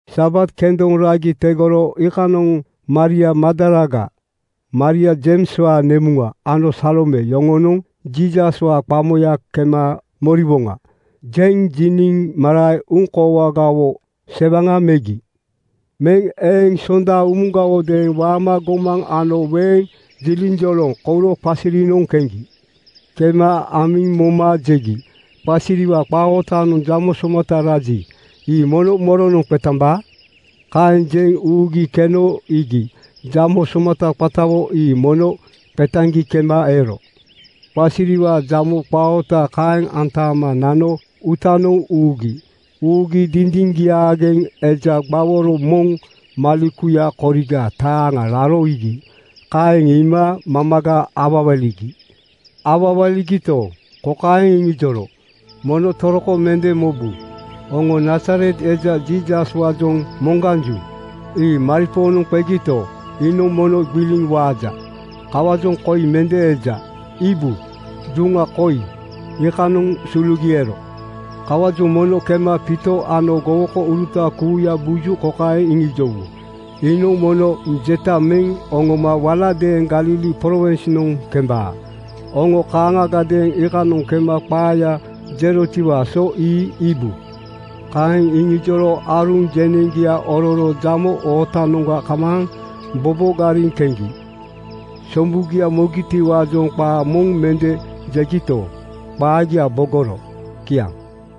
Sabat kendoŋ ragi tegoro iikanoŋ Maria Magdalaga, Maria Jeimswaa nemuŋa ano Salome yoŋonoŋ “Jiisaswaa qamoya kema moriwoŋa,” jeŋ jiniŋ marae uŋkoowagawo sewaŋa megi. Meŋ eŋ Sonda umugawodeeŋ waama gomaŋ ano weeŋ jiliŋjolaŋ kouro qasirinoŋ keŋgi. Kema amiŋ moma jegi, “Qasiriwaa qaa ootanoŋ jamo somata raji, ii mono moronoŋ qetambaa?” Kaeŋ jeŋ uugi keno iigi: Jamo somata qatawo ii mono qetaŋgi kema ero. Qasiriwaa jamo qaa oota kaeŋ aantama nano uutanoŋ ugi. Ugi dindiŋgiaageŋ eja gbaworo moŋ malekuya koriga taaŋa raro iigi. Kaeŋ iima mamaga awawaligi. Awawaligito, kokaeŋ iŋijoro, “Mono toroko mende mobu. Oŋo Nazaret eja Jiisaswaajoŋ moŋganju. Ii maripoonoŋ qegito, iinoŋ mono gbiliŋ waaja. Kawaajoŋ koi mende eja. Iibu! Duŋa koi, iikanoŋ sulugi ero. Kawaajoŋ mono kema Piito ano gowokouruta kuuya buju kokaeŋ iŋijowu, ‘Iinoŋ mono jeta meŋ oŋoma waladeeŋ Galili prowinsnoŋ kembaa. Oŋo kaaŋagadeeŋ iikanoŋ kema qaaya jerotiwaa so ii iibu.” ’ Kaeŋ iŋijoro aaruŋ jeneŋgia ororo jamo ootanoŋga kamaaŋ bobogariŋ keŋgi. Sombugia mogitiwaajoŋ qaa moŋ mende jegito, qaagia bogoro. Kiaŋ.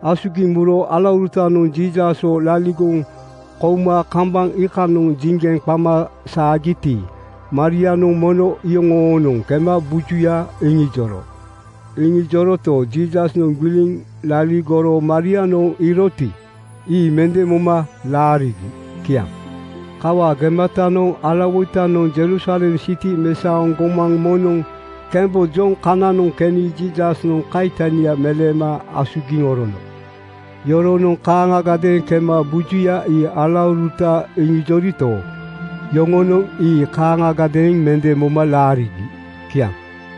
Asugiŋ muro alaurutanoŋ Jiisaswo laligoŋ kouma kambaŋ iikanoŋ jiŋgeŋ qama saagiti, Marianoŋ mono iyoŋoonoŋ kema bujuya iŋijoro. Iŋijoroto, Jiisasnoŋ gbiliŋ laligoro Marianoŋ iiroti, ii mende moma laarigi. Kiaŋ. Kawaa gematanoŋ alawoitanoŋ Jerusalem siti mesaoŋ gomaŋ moŋnoŋ kembojoŋ kananoŋ keni Jiisasnoŋ kaitania meleema asugiŋ orono. Yoronoŋ kaaŋagadeeŋ kema bujuya ii alauruta iŋijorito, yoŋonoŋ ii kaaŋagadeeŋ mende moma laarigi. Kiaŋ.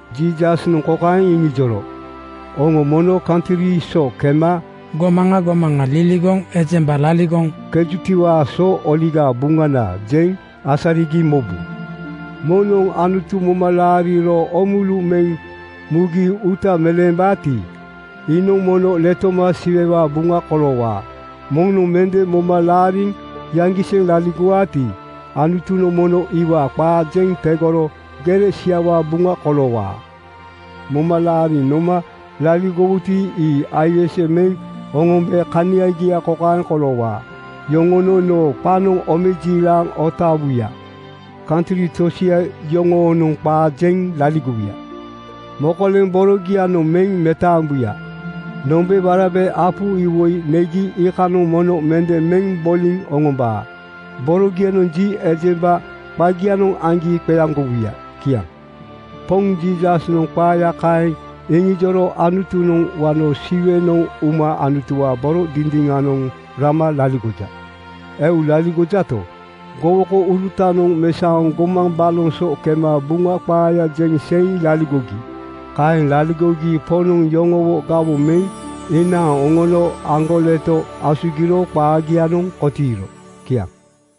Jiisasnoŋ kokaeŋ iŋijoro, “Oŋo mono kantri so kema gomaŋa gomaŋa liligoŋ ejemba laligoŋ kenjutiwaa so Oligaa Buŋana jeŋ asarigi mobu. Moŋnoŋ Anutu moma laariro oomulu meŋ mugi uuta meleembaati, iinoŋ mono letoma Siwewaa buŋa koloowaa. Moŋnoŋ mende moma laariŋ yaŋgiseŋ laligowaati, Anutunoŋ mono iwaa qaa jeŋ tegoro gere siawaa buŋa koloowaa. Moma laariŋ noma laligowuti, ii aiwese meŋ oŋombe kaniagia kokaeŋ koloowaa: Yoŋonoŋ noo qanoŋ omejiilaŋ oŋotaawuya. Kantri tosia yoŋoonoŋ qaa jeŋ laligowuya. Mokoleŋ borogianoŋ meŋ metaambuya. Nombeŋ warabe apu iwoi negi iikanoŋ mono mende meŋ boliŋ oŋombaa. Borogia ji ejemba qagianoŋ aŋgi qeaŋgowuya.” Kiaŋ. Poŋ Jiisasnoŋ qaaya kaeŋ iŋijoro Anutunoŋ wano Siwenoŋ uma Anutuwaa boro dindiŋanoŋ rama laligoja. Eu laligojato, gowokourutanoŋ mesaoŋ gomaŋ baloŋ so kema Buŋa qaaya jeŋ seiŋ laligogi. Kaeŋ laligogi Poŋnoŋ yoŋowo gawoŋ meŋ inaaŋ oŋono aŋgoleto asugiro qaagianoŋ kotiiro. Kiaŋ.